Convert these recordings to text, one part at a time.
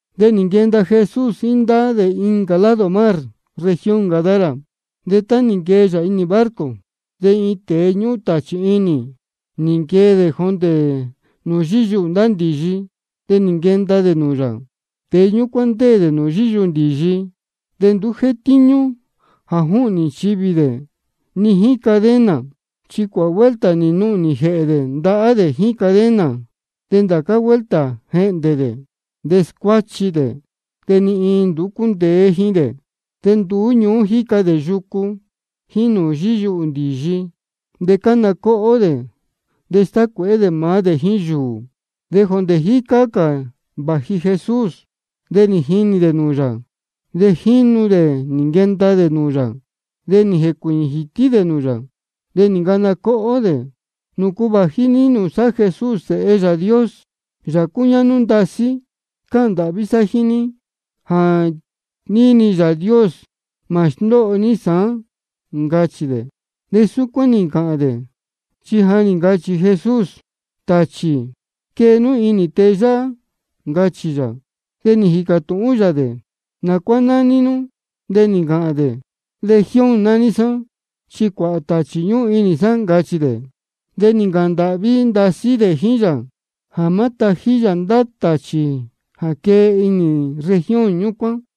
De nī nquenda Jesús jíín ndá dē incā lado mar, región Gadara. De tá nī nquee yā inī barco, de iin tēe ñúhún tāchī inī, nī nquee dē jondē nūū yíyuhū ndá ndīyi, de nī nquenda dē nūū yā. Tēe ñúcuán ndéē dē nūū yíyuhū ndīyi. De nduú jétíñú jā júhnī nchivī dē, ni jíín cadena. Chi cuāhā vuelta nī nuhnī jēhē dē ndahá dē jíín cadena. De ndācá vuelta jéhndē dē, de scuáchi dē. De ni iin nduú cúndeé jíín dē. De nduú ñuú jíca dē yucu jíín nūū yíyuhū ndīyi, de cána cóhó dē, de stácuēhé dē maá dē jíín yūū. De jondē jícá cā vāji Jesús, de nī jinī dē nūū yā. De jínu dē nī nquenda dē nūū yā, de nī jēcuīñī jītí dē nūū yā. De nī ncana cóhó dē: ¿Nūcu vāji ní nūū sá, Jesús Sēhe Yāā Dios, Yāā cúñáhnú ndasí? Cáhān ndāhví sá jíín ní, jā níni Yāā Dios, mā sndóho ní sāán, ncachī dē. Súcuán nī ncāhān dē, chi ja nī ncachī Jesús: Tāchī, quee nú quīhīn nū inī tēe yáhá, ncachī yā. De nī jīcā tūhún yā dē: ¿Nā cuá nāní nú? De nī ncāhān dē: Legión nání sá, chi cuāhā tāchī ñúhún inī sá, ncachī dē. De nī ncāhān ndāhví ndasí dē jíín yā jā má tājí yā ndá tāchī jā quee ji inī región ñúcuán.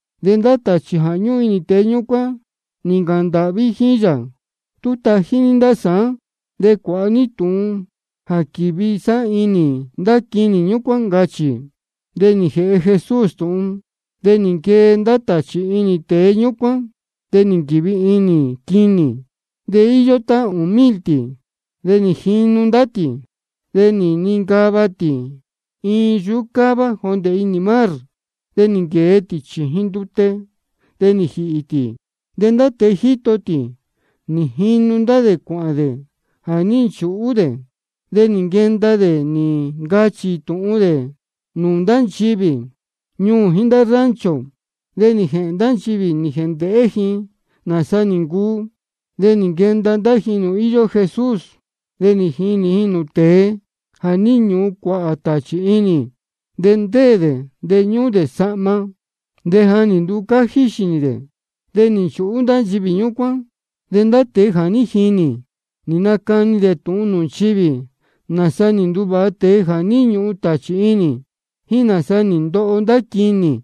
De ndá tāchī jā ñúhún inī tēe ñúcuán nī ncāhān ndāhví jíín yā: Tú tají ní ndá sá de cuāha ní tūhun jā quīvi sá inī ndá quinī ñúcuán, ncachī. De nī jēhe Jesús tūhun. De nī nquee ndá tāchī inī tēe ñúcuán, de nī nquīvi inī quinī, de íyó tá ūū mil tī. De nī jinu ndá tī, de nī nincava tī iin yuhú cává jondē inī mar. De nī nquēe tī chījin ndute, de nī jīhī tī. De ndá tēe jíto tī, nī jinu dē cuāhān dē jā ní nchūhú dē. De nī nquenda dē nī ncachī tūhun dē nūū ndá nchivī ñuū jíín ndá rancho. De nī jēhēn ndá nchivī nī jēndēhé ji nāsa nī ncuu. De nī nquenda ndá ji nūū íyó Jesús, de nī jinī ji nūū tēe jā ní ñūhun cuāhā tāchī inī. De ndéē dē, de ñúhún dē sahma, de ja nī nducájí xīnī dē. De nī nchūhú ndá nchivī ñúcuán. De ndá tēe jā ní jinī, nī nacani dē tūhun nūū nchivī, nāsa nī nduvāha tēe jā ní ñūhun tāchī inī, jíín nāsa nī ndoho ndá quinī.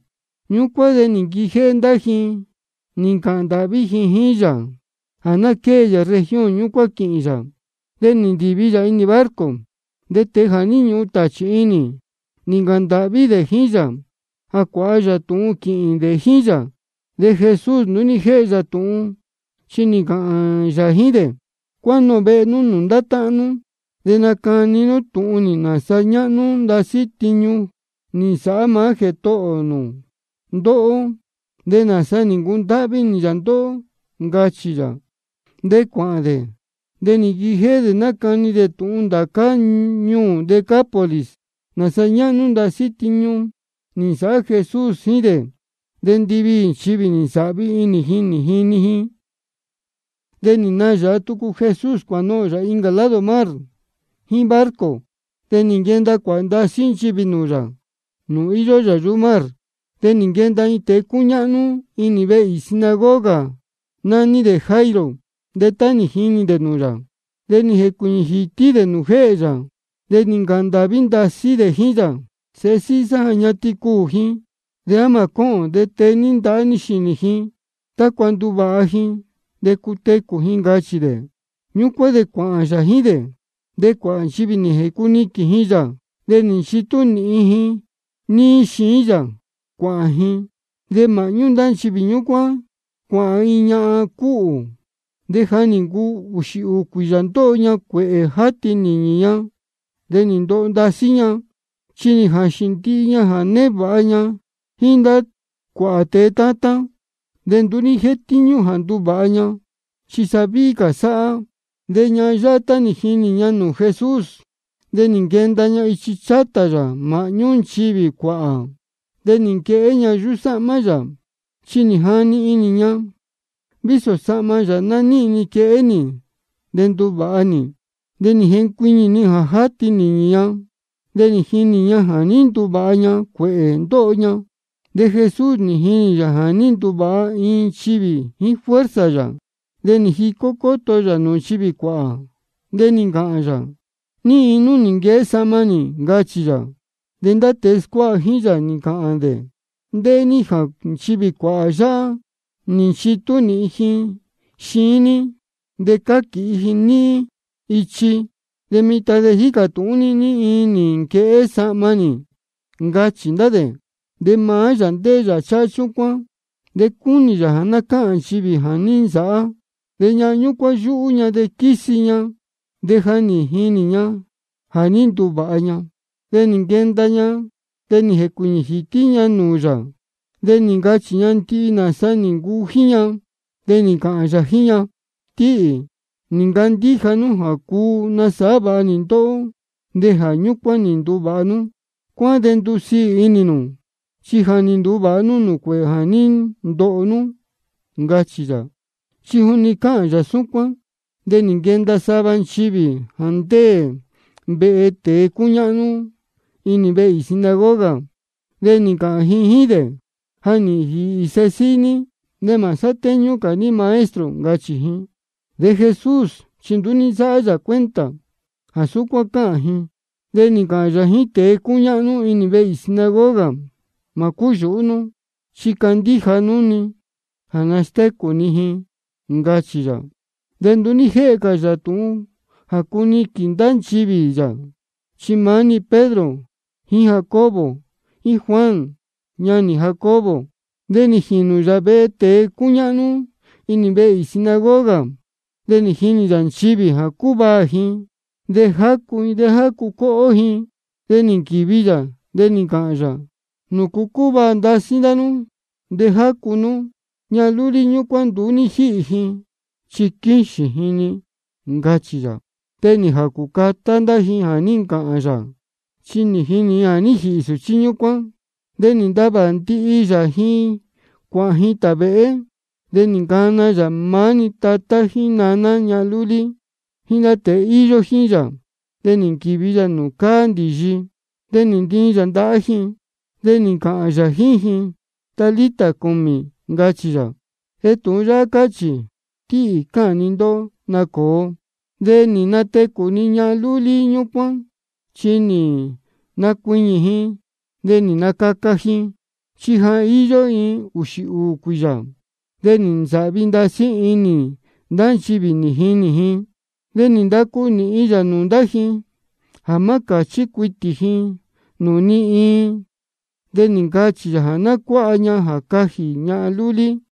Ñúcuán de nī nquijéhé ndá ji nī ncāhān ndāhví ji jíín yā jā ná quée yā región ñúcuán quīhīn yā. De nī ndīvi yā inī barco. De tēe jā ní ñūhun tāchī inī, nī ncāhān ndāhví dē jíín yā jā cuāha yā tūhun quīhīn dē jíín yā. De Jesús nduú ní jéhe yā tūhun, chi nī ncāhān yā jíín dē: Cuánohōn vehe nú nūū ndá táhán nú, de nacani nú tūhun nūū ji nāsa ñáhnú ndasí tiñu nī nsāhá maá Jētohō nū ndóhó, de nāsa nī ncundáhví inī yā ndóhó, ncachī yā. De cuāhān dē, de nī nquijéhé dē nácani dē tūhun ndācá ñuū Decápolis nāsa ñáhnú ndasí tiñu nī nsāhá Jesús jíín dē. De ndiviī nchivī nī nsāhvi inī ji nī jini ji. De nī nayāha tucu Jesús cuānohōn yā incā lado mar jíín barco. De nī nquenda cuāhā ndasí nchivī nūū yā, nūū íyó yā yuhú mar. De nī nquenda iin tēe cúñáhnú inī vehe īī sinagoga, nání dē Jairo. De tá nī jinī dē nūū yā, de nī jēcuīñī jītí dē nūū jéhē yā. De nī ncāhān ndāhví ndasí dē jíín yā: Sēhe síhí sá ja ñatin cuū ji. De á mā cóhōn de tee ní ndahá ní xīnī ji, tácua ná ndúvāha ji de cutecū ji, ncachī dē. Ñúcuán de cuāhān yā jíín dē. De cuāhā nchivī nī jēcuniquīn ji yā, de nī nchitú nīhin ji níí xiín yā cuāhān ji. De māhñú ndá nchivī cuāhān iin ñahan cúhū, de ja nī ncuu ūxī ūū cuīyā ndóho ña cuēhē játi nīñī ña. De nī ndoho ndasí ña, chi nī jāxīn ña ndihi jā névāha ña jíín cuāhā tēe tátán, de nduú ní jétíñú jā nduvāha ña, chi sa víhí cā sáhá. De ñahan yáhá tá nī jini ña tūhun Jesús, de nī nquenda ña ichi chátā yā māhñú nchivī cuāhā, de nī nquehé ña yuhú sáhmá yā. Chi nī jani inī ña: Vísō sahma yā ná níhīn ni quehé nī, de nduvāha nī. De nī jencuiñī-ni jā játi nīñī ña, de nī jinī ña jā ní nduvāha ña cuēhē ndóho ña. De Jesús nī jinī yā jā ní nduvāha iin nchivī jíín fuerza yā. De nī jicó cóto yā nūū nchivī cuāhā, de nī ncāhān yā: ¿Ní iin nī nquehé sahma nī? ncachī yā. De ndá tēe scuáha jíín yā, nī ncāhān dē: Ndéhé ní jā nchivī cuāhā yáhá nī nchitú nīhin ji xiín ní de cáquīhi ji níhín níí ichi, de mitan jícā tūhún ní ní iin nī nquehé sahma ní, ncachī ndá dē. De maá yā ndéhé yā cháhá chúcuán, cúnī yā jā ná cáhān nchivī jā ní nsāhá. De ñahan ñúcuán yúhú ña de quísi ña, de ja jínī ña jā ní nduvāha ña. De nī nquenda ña, de nī jēcuīñī jītí ña nūū yā, de nī ncachī ña ndihi nāsa nī ncuu jíín ña. De nī ncāhān yā jíín ña: Tíhī, nī ncandíja nú jā cuu nasāhá vāha nī ndóhó, de jā ñúcuán nī nduvāha nú. Cuáhán de ndusiī inī nū, chi ja nī nduvāha nú cuēhē jā ní ndoho nú, ncachī yā. De juni cáhān cā yā súcuán, de nī nquenda sava nchivī jā ndéē vehe tēe cúñáhnú inī vehe īī sinagoga, de nī ncāhān ji jíín dē: Ja nī jīhī sēhe síhí ní. De mā sátéñú ní cā Maestro, ncachī ji. De Jesús chi nduú ní nsáhá yā cuenta jā súcuán cáhān ji, chi nī ncāhān yā jíín tēe cúñáhnú inī vehe īī sinagoga: Mā cúyūhú nú, chi candíja nú-ni jā nastécū ni ji, ncachī yā. De nduú ní jéhe cā yā tūhun jā cuniquīn ndá nchivī yā, chi maá-ni Pedro jíín Jacobo, jíín Juan ñanī Jacobo. De nī jīnū yā vehe tēe cúñáhnú inī vehe īī sinagoga, de nī jinī yā nchivī, de cúvaā ji, de jácu ji, de jácu cóhó ji. De nī nquīvi yā, de nī ncāhān yā: ¿Nūcu cúvaā ndasí ndá nú de jácu nú? Ñahan lúlí ñúcuán nduú ní jíhī ji, chi quíxīn ji-ni, ncachī yā. De nī jācū catá ndá ji jā ní ncāhān yā, chi jínī ji jā ní jīhī sūchí ñúcuán. De nī ntavā ndihi yā ji cuāhān ji tāvēhé. De nī ncana yā maá-ni tatá jíín naná ñahan lúlí, jíín ndá tēe íyó jíín yā, de nī nquīvi yā nūū cáá ndīyi. De nī ntiin yā ndahá ji, de nī ncāhān yā jíín ji: Talita cumi, ncachī yā. De tūhun yáhá cáchī: Tíhī, cáhān ni ndóhó, nacōo. De nī natecū-ni ñahan lúlí ñúcuán, chi nī nacuiñī ji de nī nacaca ji, chi ja íyó ji ūxī ūū cuīyā. De nī nsāhvi ndasí inī ndá nchivī nī jinī ji. De nī ndacu nīhin yā nūū ndá ji jā má cāchí cuitī ji nūū ni iin. De nī ncachī yā jā ná cuáha ña jā cajī ñahan lúlí.